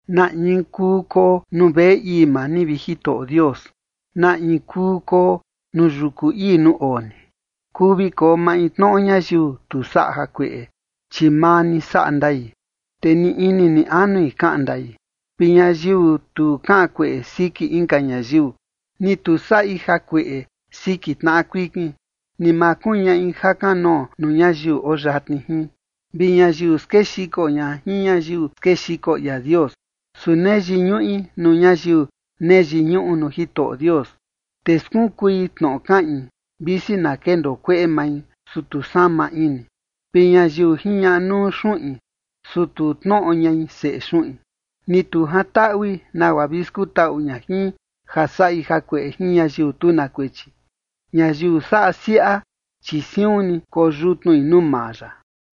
¿Na in kuu koo nuu veꞌe ii maa ni, vi Jitoꞌo Dios? ¿Na in kuu koo nuu yuku ii nuu oo ni? Kuu vi koo maintnoꞌo ñayiu tu saꞌa jakueꞌe, chi maa ni saꞌa ndai, te ni ini ni anui kaꞌan ndai, vi ñayiu tu kaꞌan kueꞌe siki inka ñayiu, ni tu saꞌi jakueꞌe siki tnaꞌa kuikin, ni ma kuñaꞌi jakanoo nuu ñayiu oo yatni jin, vi ñayiu skexiko ña jin ñayiu skexiko ia Dios, su nee yiñuꞌi nuu ñayiu nee yiñuꞌu nuu Jitoꞌo Dios, te skunkui tnoꞌo kaꞌin, visi na kendoo kueꞌe mai, su tu sama ini, vi ñayiu jiñaꞌa nuu xuꞌin, su tu tnoꞌo ñai seꞌe xuꞌin, ni tu jantaꞌui nagua vi skutaꞌu ña jin ja saꞌi jakueꞌe jin ñayiu tu na kuechi. Ñayiu saꞌa siaꞌa, chi siun ni koyutnui nuu maa ya.